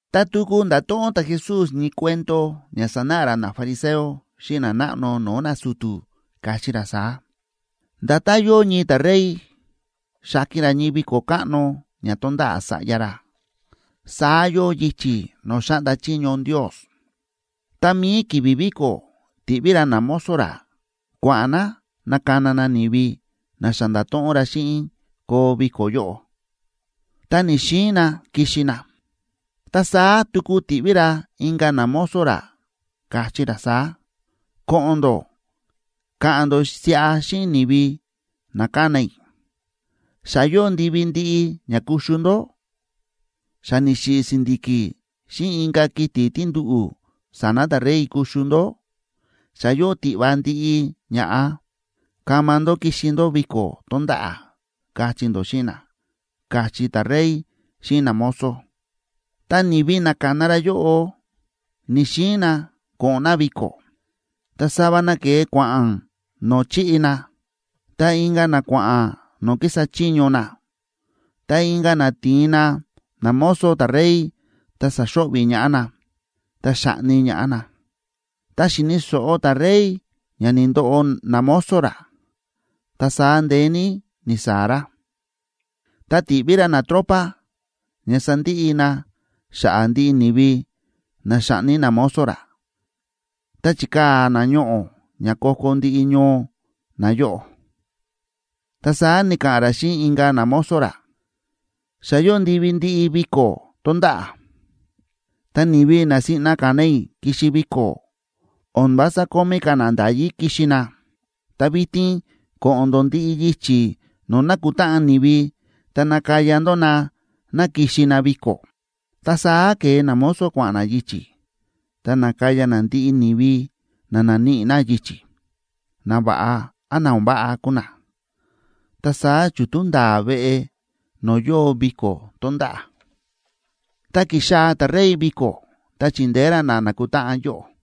Ta tuku nda̱to̱ꞌon ta̱Jesús ñii cuento ña sanáꞌa ra nafariseo xíꞌin nanáꞌno no̱o̱ nasu̱tu̱, káchí ra saá: ―Nda̱tán yóo ñii ta̱rey xa̱ki̱n ra ñii viko̱ káꞌno ña tonda̱ꞌa̱ sa̱ꞌya ra, saá yóo yichi̱ no̱o̱ xáꞌnda chiño Ndios. Ta mi̱i ki̱vi̱ viko̱ ti̱ꞌví ra namozo ra kua̱ꞌa̱n na nakana na ni̱vi na xa nda̱to̱ꞌon ra xíꞌin koo viko̱ yóꞌo, ta ni̱‑xiin na kixi na. Ta saá tuku ti̱ꞌví ra inka̱ namozo ra, káchí ra saá: “Ko̱ꞌo̱n ndó ka̱ꞌa̱n ndó siꞌa xíꞌin ni̱vi na ka̱na i̱: Xa yóo ndivi ndiꞌi ña kuxu ndó. Xa ni̱xiꞌi̱ si̱ndi̱ki̱ xíꞌin inka̱ kiti̱ tí nduꞌu̱ sa̱na̱ ta̱rey kuxu ndó; xa yóo tiꞌva ndiꞌi ña̱ꞌa. Kama ndó kixi ndó viko̱ tonda̱ꞌa̱, kachí ndó xíꞌin na”, káchí ta̱rey xíꞌin namozo. Ta ni̱vi na ka̱na ra yóꞌo ni̱‑xiin na ko̱ꞌo̱n na viko̱, ta sava na ke̱e kua̱ꞌa̱n no̱o̱ chi̱ꞌi na, ta inka̱ na kua̱ꞌa̱n no̱o̱ kísa chiño na. Ta inka̱ na ti̱in na namozo ta̱rey, ta sa̱xo̱ꞌvi̱ ñaꞌá na, ta xa̱ꞌni ñaꞌá na. Ta xi̱ni̱ so̱ꞌo ta̱rey ña ni̱ndoꞌo namozo ra, ta saá ndeé ní ni̱saa̱ ra. Ta ti̱ꞌví ra natropa ña sandiꞌi na xa̱ꞌa̱ ndiꞌi ni̱vi na xa̱ꞌni namozo ra ta chikaa̱ na ñoꞌo̱ ña ko̱ko̱ ndiꞌi ñoo nayóꞌo. Ta saá ni̱ka̱ꞌa̱n ra xíꞌin inka̱ namozo ra: “Xa yóo ndivi ndiꞌi viko̱ tonda̱ꞌa̱, ta ni̱vi na siꞌna ka̱na i̱ kixi viko̱, o̱n vása kómí ka̱ na nda̱yí kixi na. Ta vitin ko̱ꞌo̱n ndó ndiꞌi yichi̱ no̱o̱ nákutáꞌan ni̱vi ta nakaya ndó na ná kixi na viko̱.” Ta saá ke̱e namozo kua̱ꞌa̱n na yichi̱, ta na̱kaya na ndiꞌi ni̱vi na na̱níꞌi na yichi̱, nava̱ꞌa án na o̱n váꞌa kúu na, ta saá chútú nda̱a̱ veꞌe no̱o̱ yóo viko̱ tonda̱ꞌa̱. ’Ta ki̱xaa̱ ta̱rey viko̱ ta chi̱ndeé ra na na̱kutáꞌan yóꞌo,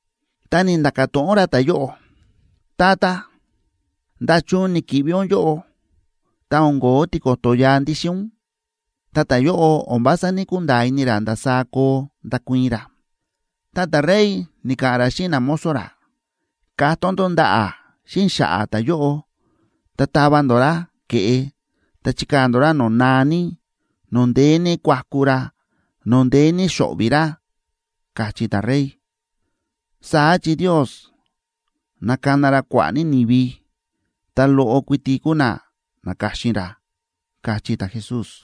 Ta ni̱nda̱ka̱ to̱ꞌon ra ta̱yóꞌo: “Tata, ¿nda̱chun ni̱ki̱ꞌvi ún yóꞌo, ta o̱n ko̱ó tiko̱to̱ yaa ndíxin ún?” Ta ta̱yóꞌo o̱n vása ní‑kunda̱a̱ ini ra ndasaá koo ndakuii̱n ra. Ta ta̱rey ni̱ka̱ꞌa̱n ra xíꞌin namozo ra: “Katón ndó ndaꞌa̱ xíꞌin xa̱ꞌa̱ ta̱yóꞌo ta tava ndó ra ke̱ꞌe, ta chikaa̱ ndó ra no̱o̱ naa ní, no̱o̱ ndeé ní kuaku ra, no̱o̱ ndeé ní xo̱ꞌvi̱ ra”, káchí ta̱rey. Saá chi Ndios nákana ra kua̱ꞌa̱ ní ni̱vi, ta loꞌo kuiti kúu na na̱ka̱xin ra ―káchí ta̱Jesús.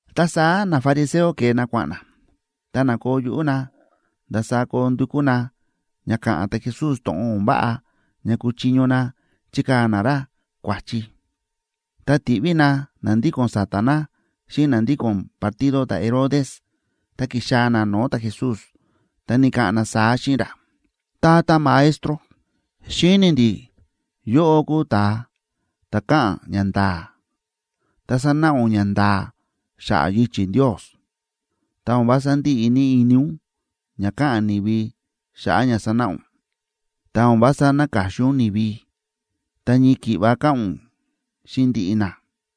Ta saá nafariseo ke̱e na kua̱ꞌa̱n na, ta na̱koo yuꞌú na ndasaá koo ndukú na ña ka̱ꞌa̱n ta̱Jesús to̱ꞌon o̱n váꞌa ña kuchiño na chikaa̱ na ra kua̱chi. Ta ti̱ꞌví na na ndíko̱n sa̱ta̱ na xíꞌin na ndíko̱n partido ta̱Herodes, ta ki̱xaa̱ na no̱o̱ ta̱Jesús, ta ni̱ka̱ꞌa̱n na saá xíꞌin ra: ―Tata Maestro, xíni̱ ndi̱ yóꞌó kúu ún ta̱a ta̱ káꞌa̱n ñanda̱a̱, ta sánáꞌa ún ñanda̱a̱ xa̱ꞌa̱ yichi̱ Ndios. Ta o̱n vása ndíꞌi ini ún ña káꞌa̱n ni̱vi xa̱ꞌa̱ ña sánáꞌa ún, ta o̱n vása náka̱xin ún ni̱vi, ta ñii ki̱ꞌva káꞌa̱n ún xíꞌin ndiꞌi na.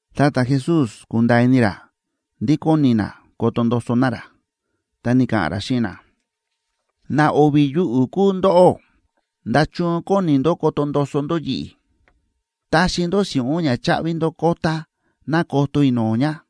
Ta ta̱Jesús kúnda̱a̱ ini ra ndí kóni na koto ndoso na ra, ta ni̱ka̱ꞌa̱n ra xíꞌin na: ―¡Na o̱vi̱ yuꞌu̱ kúu ndóꞌó! ¿Nda̱chun kóni ndó koto ndoso ndó yi̱ꞌi̱? Taxi ndó si̱ꞌún ña cháꞌvi ndó kota ná koto i̱ no̱o̱ ña.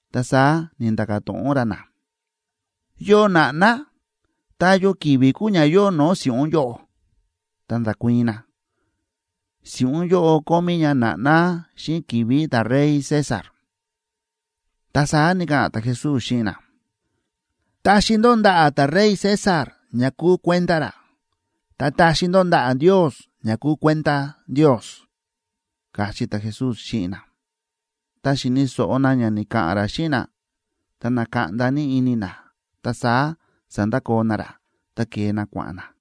Ta saá ni̱nda̱ka̱ to̱ꞌon ra na: ―¿Yo na̱ꞌná, ta yo ki̱vi̱ kúu ña yóo no̱o̱ si̱ꞌún yóꞌo? Ta nda̱kuii̱n na: ―Si̱ꞌún yóꞌo kómí ña na̱ꞌná xíꞌin ki̱vi̱ ta̱rey César. Ta saá ni̱ka̱ꞌa̱n ta̱Jesús xíꞌin na: ―Taxi ndó ndaꞌa̱ ta̱rey César ña kúu kuenda ra, ta taxi ndó ndaꞌa̱ Ndios ña kúu kuenda Ndios ―káchí ta̱Jesús xíꞌin na. Ta xi̱ni̱ so̱ꞌo na ña ni̱ka̱ꞌa̱n ra xíꞌin na, ta na̱kaꞌnda ní ini na. Ta saá sa̱ndakoo na ra, ta ke̱e na kua̱ꞌa̱n na.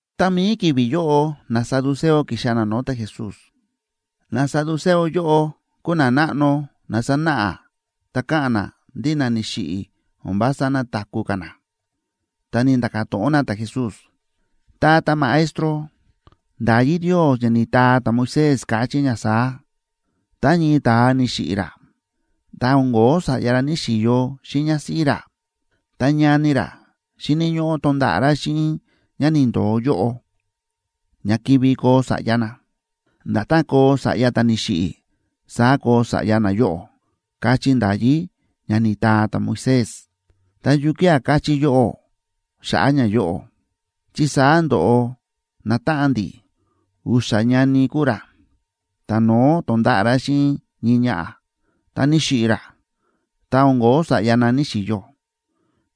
Ta mi̱i ki̱vi̱ yóꞌo, nasaduceo ki̱xaa̱ na no̱o̱ ta̱Jesús. Nasaduceo yóꞌo kúu nanáꞌno na sánáꞌa ta káꞌa̱n na ndí na ni̱xiꞌi̱ o̱n vása nataku̱ ka̱ na. Ta ni̱nda̱ka̱ to̱ꞌon na ta̱Jesús: ―Tata Maestro, nda̱yí Ndios ña ni̱taa ta̱Moisés, káchí ña saá: “Tá ñii ta̱a ni̱xiꞌi̱ ra, ta o̱n ko̱ó sa̱ꞌya ra ní‑xiyo xíꞌin ñásíꞌí ra, ta ñani ra xíni̱ ñóꞌó tonda̱ꞌa̱ ra xíꞌin ñá ni̱ndo̱o yóꞌo, ña kivi koo sa̱ꞌya na. Nda̱tán koo sa̱ꞌya ta̱ ni̱xiꞌi̱, saá koo sa̱ꞌya nayóꞌo”, káchí nda̱yí ña ni̱taa ta̱Moisés. Ta, ¿yukía̱ káchí yóꞌó xa̱ꞌa̱ ñayóꞌo? Chi saá ndo̱ꞌo natáꞌan ndi̱, u̱xa̱ ñani kúu ra. Ta̱no̱ó to̱nda̱ꞌa̱ ra xíꞌin ñii ñaꞌa̱, ta ni̱xiꞌi̱ ra, ta o̱n ko̱ó sa̱ꞌya na ní‑xiyo.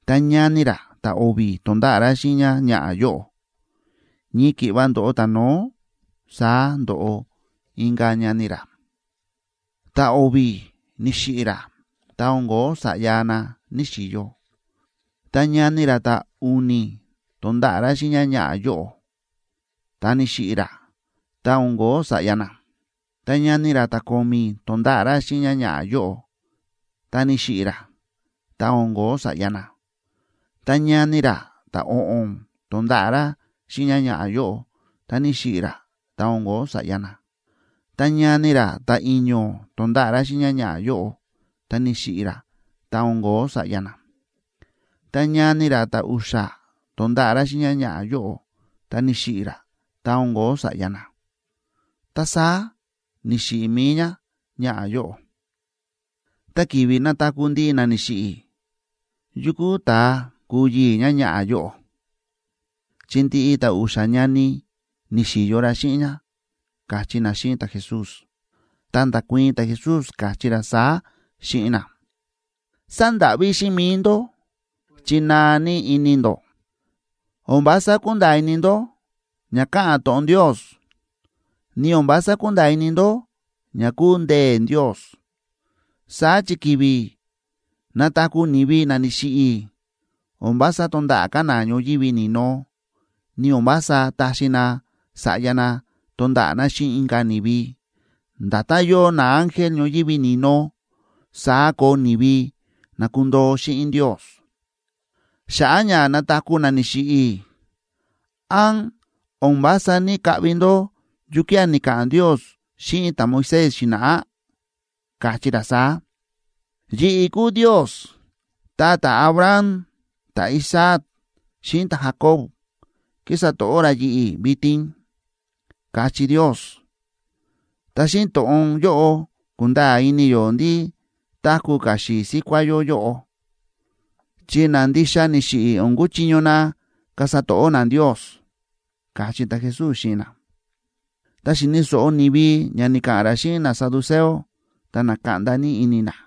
Ta ñani ra ta̱o̱vi̱ to̱nda̱ꞌa̱ ra xíꞌin ñáñaꞌa̱ yóꞌo. Ñii ki̱ꞌva ndo̱ꞌo ta̱no̱ó, saá ndo̱ꞌo inka̱ ñani ra. Ta̱o̱vi̱ ni̱xiꞌi̱ ra, ta o̱n ko̱ó sa̱ꞌya na ní‑xiyo. Ta ñani ra ta̱u̱ni̱ to̱nda̱ꞌa̱ ra xíꞌin ñáñaꞌa̱ yóꞌo, ta ni̱xiꞌi̱ ra, ta o̱n ko̱ó sa̱ꞌya na. Ta ñani ra ta̱ko̱mi̱ to̱nda̱ꞌa̱ ra xíꞌin ñáñaꞌa̱ yóꞌo, ta ni̱xiꞌi̱ ra, ta o̱n ko̱ó sa̱ꞌya na. Ta ñani ra ta̱o̱ꞌo̱n to̱nda̱ꞌa̱ ra xíꞌin ñáñaꞌa̱ yóꞌo, ta ni̱xiꞌi̱ ra, ta o̱n ko̱ó sa̱ꞌya na. Ta ñani ra ta̱i̱ño̱ to̱nda̱ꞌa̱ ra xíꞌin ñáñaꞌa̱ yóꞌo, ta ni̱xiꞌi̱ ra, ta o̱n ko̱ó sa̱ꞌya na. Ta ñani ra ta̱u̱xa̱ to̱nda̱ꞌa̱ ra xíꞌin ñáñaꞌa̱ yóꞌo, ta ni̱xiꞌi̱ ra, ta o̱n ko̱ó sa̱ꞌya na. Ta saá ni̱xiꞌi̱ mi̱i ñáñaꞌa̱ yóꞌo. Ta ki̱vi̱ nataku̱ ndiꞌi na ni̱xiꞌi̱, ¿yukú ta̱a kuu yii̱ ñáñaꞌa̱ yóꞌo?, chi ndiꞌi ta̱a u̱xa̱ ñani ni̱xi̱yo ra xíꞌin ñá ―káchí na xíꞌin ta̱Jesús. Ta nda̱kuii̱n ta̱Jesús, káchí ra saá xíꞌin na: ―Sándáꞌví xíꞌin mi̱i ndó, chi naa ní ini ndó, o̱n vása kúnda̱a̱ ini ndó ña káꞌa̱n to̱ꞌon Ndios, ni o̱n vása kúnda̱a̱ ini ndó ña kúu ndee̱ Ndios. Saá chi ki̱vi̱ nataku̱ ni̱vi na ni̱xiꞌi̱, o̱n vása tonda̱ꞌa̱ ka̱ na ñoyívi ni̱no, ni o̱n vása taxi na sa̱ꞌya na tonda̱ꞌa̱ na xíꞌin inka̱ ni̱vi. Nda̱tán yóo naángel ñoyívi ni̱no, saá koo ni̱vi na kundoo xíꞌin Ndios. Xa̱ꞌa̱ ña nataku̱ na ni̱xiꞌi̱, ¿án o̱n vása ní‑kaꞌvi ndó yukía̱ ni̱ka̱ꞌa̱n Ndios xíꞌin ta̱Moisés xi̱na̱ꞌá? Káchí ra saá: “Yi̱ꞌi̱ kúu Ndios, ta ta̱Abraham, ta̱Isaac, xíꞌin ta̱Jacob kísa to̱ꞌó ra yi̱ꞌi̱ vitin”, káchí Ndios. Ta xíꞌin to̱ꞌon yóꞌo kúnda̱a̱ ini yó ndí táku̱ ka̱ xi̱i̱ síkuá yó yóꞌo, chi na ndixa ni̱xiꞌi̱ o̱n kuchiño na kasa to̱ꞌó na Ndios ―káchí ta̱Jesús xíꞌin na. Ta xi̱ni̱ so̱ꞌo ni̱vi ña ni̱ka̱ꞌa̱n ra xíꞌin nasaduceo, ta na̱kaꞌnda ní ini na.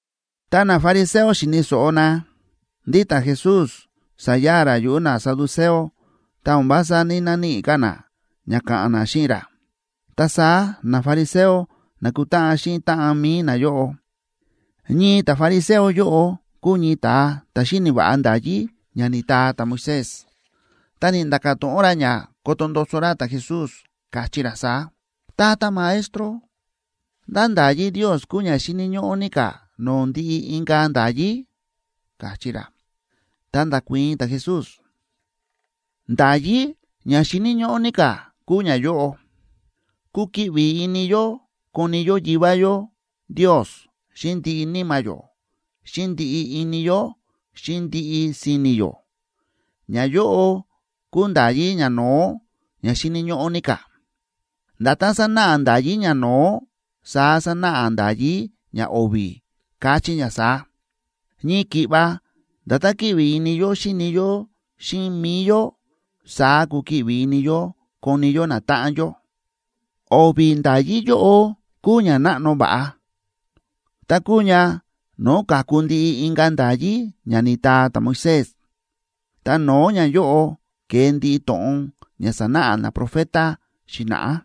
Ta nafariseo xi̱ni̱ so̱ꞌo na ndí ta̱Jesús sa̱ya̱a̱ ra yuꞌu̱ nasaduceo ta o̱n vása ní‑naníꞌi ka̱ na ña ka̱ꞌa̱n na xíꞌin ra, ta saá nafariseo na̱kutáꞌan xíꞌin táꞌan mi̱i nayóꞌo. Ñii ta̱fariseo yóꞌo kúu ñii ta̱a ta̱ xíni̱ va̱ꞌa nda̱yí ña ni̱taa ta̱Moisés, ta ni̱nda̱ka̱ to̱ꞌon ra ña koto ndoso ra ta̱Jesús, káchí ra saá: ―Tata Maestro, ¿ndá nda̱yí Ndios kúu ña xíni̱ ñóꞌó ní ka̱ no̱o̱ ndiꞌi inka̱ nda̱yí? ―káchí ra. Ta nda̱kuii̱n ta̱Jesús: ―Nda̱yí ña xíni̱ ñóꞌó ní ka̱ kúu ñayóꞌo: “Kukiꞌvi ini yó koni yó Yivá yó Ndios xíꞌin ndiꞌi níma̱ yó, xíꞌin ndiꞌi ini yó, xíꞌin ndiꞌi si̱ni̱ yó.” Ñayóꞌo kúu nda̱yí ñano̱ó, ña xíni̱ ñóꞌó ní ka̱. Nda̱tán sánáꞌa nda̱yí ñano̱ó, saá sánáꞌa nda̱yí ñao̱vi̱, káchí ña saá: “Ñii ki̱ꞌva nda̱tán kíꞌvi ini yó xíni yó xíꞌin mi̱i yó, saá kukiꞌvi ini yó koni yó natáꞌan yó.” O̱vi̱ nda̱yí yóꞌo kúu ña náꞌno va̱ꞌa, ta kúu ña no̱o̱ ka̱ku ndiꞌi inka̱ nda̱yí ña ni̱taa ta̱Moisés, ta no̱o̱ ñayóꞌo ke̱e ndiꞌi to̱ꞌon ña sa̱náꞌa naprofeta xi̱na̱ꞌá.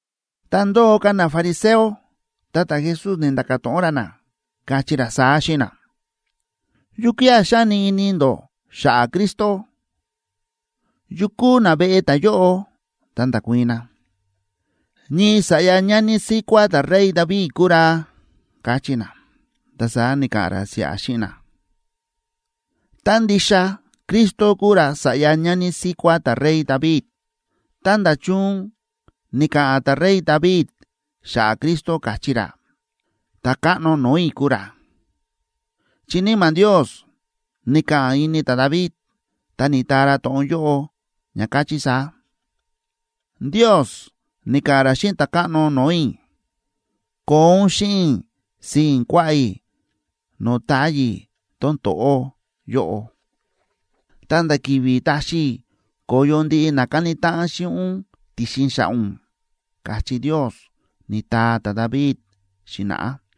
Ta ndóo ka̱ nafariseo, ta ta̱Jesús ni̱nda̱ka̱ to̱ꞌon ra na, káchí ra saá xíꞌin na: ―¿Yukía̱ xáni ini ndó xa̱ꞌa̱ Cristo? ¿Yu kúu naveꞌe ta̱yóꞌo? Ta nda̱kuii̱n na: ―Ñii sa̱ꞌya ñani síkuá ta̱rey David kuu ra ―káchí na. Ta saá ni̱ka̱ꞌa̱n ra siꞌa xíꞌin na: ―Tá ndixa Cristo kuu ra sa̱ꞌya ñani síkuá ta̱rey David, ¿ta nda̱chun ni̱ka̱ꞌa̱n ta̱rey David xa̱ꞌa̱ Cristo, káchí ra: “Ta̱káꞌno no̱o̱ i̱ kúu ra”? Chi Níma̱ Ndios ni̱ka̱ꞌa̱n ini ta̱David, ta ni̱taa ra to̱ꞌon yóꞌo, ña káchí saá: Ndios ni̱ka̱ꞌa̱n ra xíꞌin Ta̱káꞌno no̱o̱ i̱: “Koo ún xíꞌin i̱ sii̱n kuaꞌá i̱ no̱o̱ táyi̱ tón to̱ꞌó yóꞌo, ta̱nda̱ ki̱vi̱ taxi i̱ ko̱yo ndiꞌi na káni táꞌan xíꞌin ún ti̱xin xa̱ꞌa̱ ún”, káchí Ndios, ni̱taa ta̱David xi̱na̱ꞌá.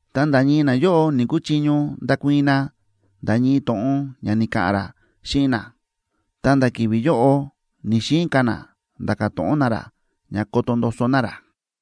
Ta nda̱ ñii nayóꞌo ni̱‑kuchiño ndakuii̱n na nda̱ ñii to̱ꞌon ña ni̱ka̱ꞌa̱n ra xíꞌin na, ta nda̱ ki̱vi̱ yóꞌo ni̱‑xiin ka̱ na nda̱ka̱ to̱ꞌon na ra ña koto ndoso na ra.